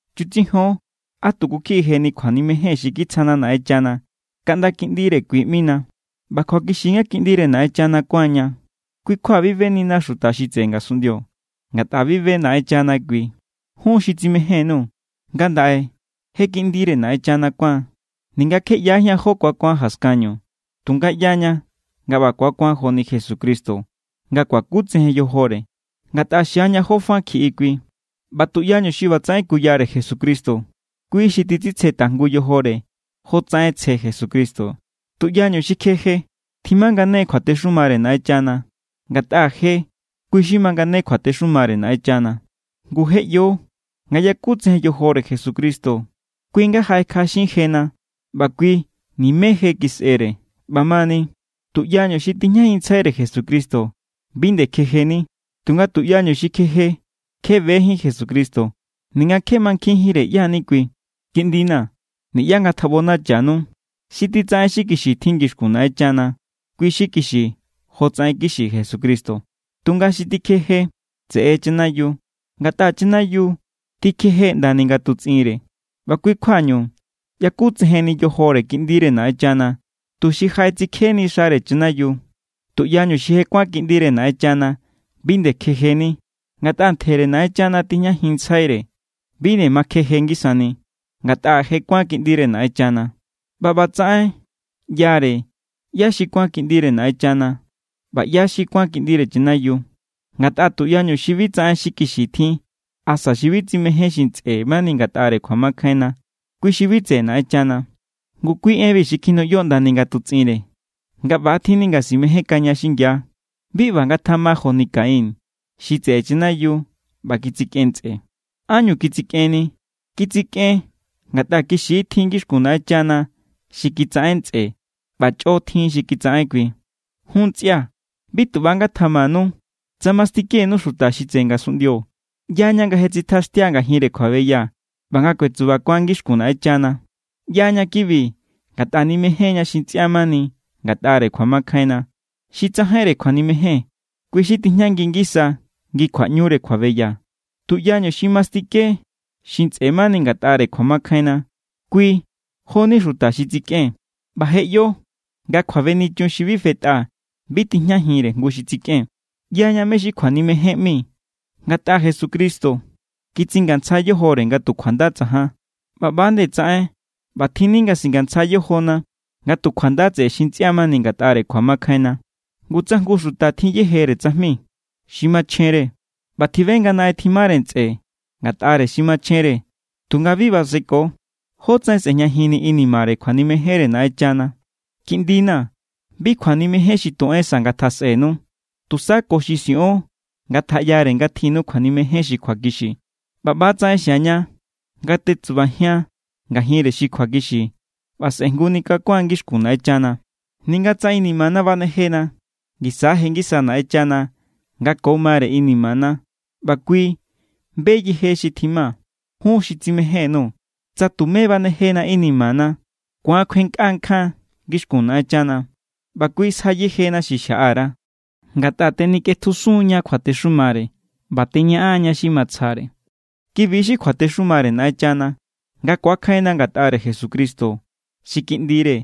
Chutsijon á tuku kjiꞌi jeni kjuanimejen xi kitsjana Naꞌenchana kaꞌnda kiꞌndire kui ꞌmina. ꞌBa kjuakixi= nga kiꞌndire Naꞌenchana kuánña. Kui= kjua bi benina xuta xi tseꞌe ngasunꞌndio, ngatꞌa bi be Naꞌenchana kui. Jun xi tsimején_nuu̱, ngandaꞌe je kiꞌndire Naꞌenchana kuáan. Ninga kje ꞌyajían jó ku̱akuan jaskanñu, tunga ꞌyaña nga ꞌba ku̱akuan joni Jesucristo nga kuakutsejen yojore, ngatꞌa xiaña jó fa kjiꞌi kui. ꞌBa tuꞌyañu xi ꞌbatsaꞌen kuyare Jesucristo, kui xi titsitsje tajngu yojore jotsaꞌen tsje Jesucristo. Tuꞌyañu xi kjeje, tjimangane= kjuatexumare Naꞌenchana. Ngatꞌa je, kui xi mangane kjuatexumare Naꞌenchana. Ngu je ꞌyo nga yakutsejen yojore Jesucristo kui= nga jaꞌekjaꞌaxin jena, ꞌba kui nimé je kisꞌere. ꞌBamani, tuꞌyañu xi tijñajinntsjaire Jesucristo, bi nde kjejeni. Tunga tuꞌyañu xi tikjeje, kje bejín Jesucristo ninga kje mankjinjínre ꞌyá= ni kui. Kiꞌndina̱, niꞌyá ngatjaꞌbonachanu. Xi titsaꞌen xi kixi tjin ngixkun Naꞌenchana, kui xi kixi jotsaꞌen kixi Jesucristo. Tunga xi tikjeje, tseꞌe= chanayiu, ngatꞌa chanayiu tikjeje ꞌndani ngatutsꞌinre. ꞌBa kui= kjuañu yakutsejenni yojore Kiꞌndire Naꞌenchana, tuxi jaꞌetsikjeni xare chanayiu. Tuꞌyañu xi je kuán kiꞌndire Naꞌenchana bi nde kjejeni, ngatꞌa ntjere Naꞌenchana tijñajinntsjaire. Bi nde ma kjeje ngisani, ngatꞌa je kuán kiꞌndire Naꞌenchana. ꞌBa ꞌbatsaꞌen ꞌyare ꞌyá= xi kuán kiꞌndire Naꞌenchana ꞌba ꞌyá= xi kuán kiꞌndire chanayiu. Ngatꞌa tuꞌyañu xi bi tsaꞌen xi kixi tjin asa xi bi tsimején xi ntsꞌe mani ngatꞌare kjuamakjainna, kui xi bi tseꞌe Naꞌenchana. Ngu kui enbi xi kjinuꞌyo ꞌndani ngatutsꞌinre, nga ꞌba=tjinni nga simejénkaña xingia. Bi ꞌba ngatjama joni Caín xi tseꞌe chanayiu ꞌba kitsikꞌen ntsꞌe. ¿Ánñu kitsikꞌenni? Kitsikꞌen ngatꞌa kixi= tjin ngixkun Naꞌenchana xi kitsaꞌen ntsꞌe, ꞌba chꞌo tjin xi kitsaꞌen kui. Jun ntsꞌia̱, bi tu ꞌba= ngatamanu tsa mastikenu xuta xi tseꞌe ngasunꞌndio. ꞌYaña nga je tsitjaxtia ngajinre kjuabeya ꞌba nga kuetsubakuan ngixkun Naꞌenchana. ꞌYaña kibi ngatꞌa nimején=ña xi ntsꞌia mani ngatꞌare kjuamakjainna. Xi tsajainre kjuanimejen, kui xi tijñangi ngisa ngi kjuaꞌñure kjuabeya. Tuꞌyañu xi mastike xi ntsꞌe mani ngatꞌare kjuamakjainna, kui jo=ni xuta xi tsikꞌen. ꞌBa je ꞌyo nga kjuabenichun xi bi fetꞌa bi tijñajinre jngu xi tsikꞌen. ꞌYaña mé= xi kjuanimejen ꞌmi ngatꞌa Jesucristo kitsingantsja yojore nga tu kjuanda tsajan. ꞌBa ꞌba=nde tsaꞌen ꞌbatjinni nga singantsja yojona nga tu kjuanda tseꞌe xi ntsꞌia mani ngatꞌare kjuamakjainna. Ngu tsa jngu xuta tjin yejere tsajmi xi machjenre ꞌba tjibe nga naꞌen tjimare ntsꞌe ngatꞌare xi machjenre tunga bi baseko, ¿jótsaꞌen sꞌe̱jñajinni inimare kjuanimejenre Naꞌenchana? Kiꞌndina̱, bi kjuanimejen xi tu en sa ngatjasꞌenu, tusa ko xi siꞌon ngatjaꞌyare nga tjinnu kjuanimejen xi kjuakixi. ꞌBa ꞌba=tsaꞌen xiaña nga tetsubajian ngajinre xi kjuakixi ꞌba sꞌe̱jnguni kakua̱n ngixkun Naꞌenchana. Ninga tsa inimana banejena, ngisa= je ngisa Naꞌenchana nga ko mare inimana ꞌba kui be yeje xi tjima. Jun xi tsimején_nuu̱, tsa tumé banejena inimana, ku̱an kjuenkꞌa nkjan ngixkun Naꞌenchana, ꞌba kui sja yejena xi xjaꞌa_ra, ngatꞌa tenikꞌetjusun=ña kjuatexumare ꞌba teñaꞌan=ña xi matsjare. Kibi= xi kjuatexumare Naꞌenchana, nga ku̱akjainna ngatꞌare Jesucristo xi Kiꞌndire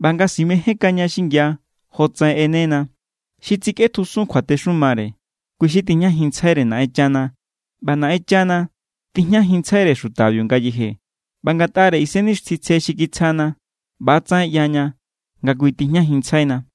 ꞌba nga simejénkaña xingia, jotsaꞌen ꞌenena. Xi titsikꞌetjusun kjuatexumare, kui xi tijñajinntsjaire Naꞌenchana ꞌba Naꞌenchana tijñajinntsjaire xutabiu ngayeje. ꞌBa ngatꞌare Isennixtjintsje xi kitsjana, ꞌba=tsaꞌen ꞌyaña nga kui tijñajinntsjaina.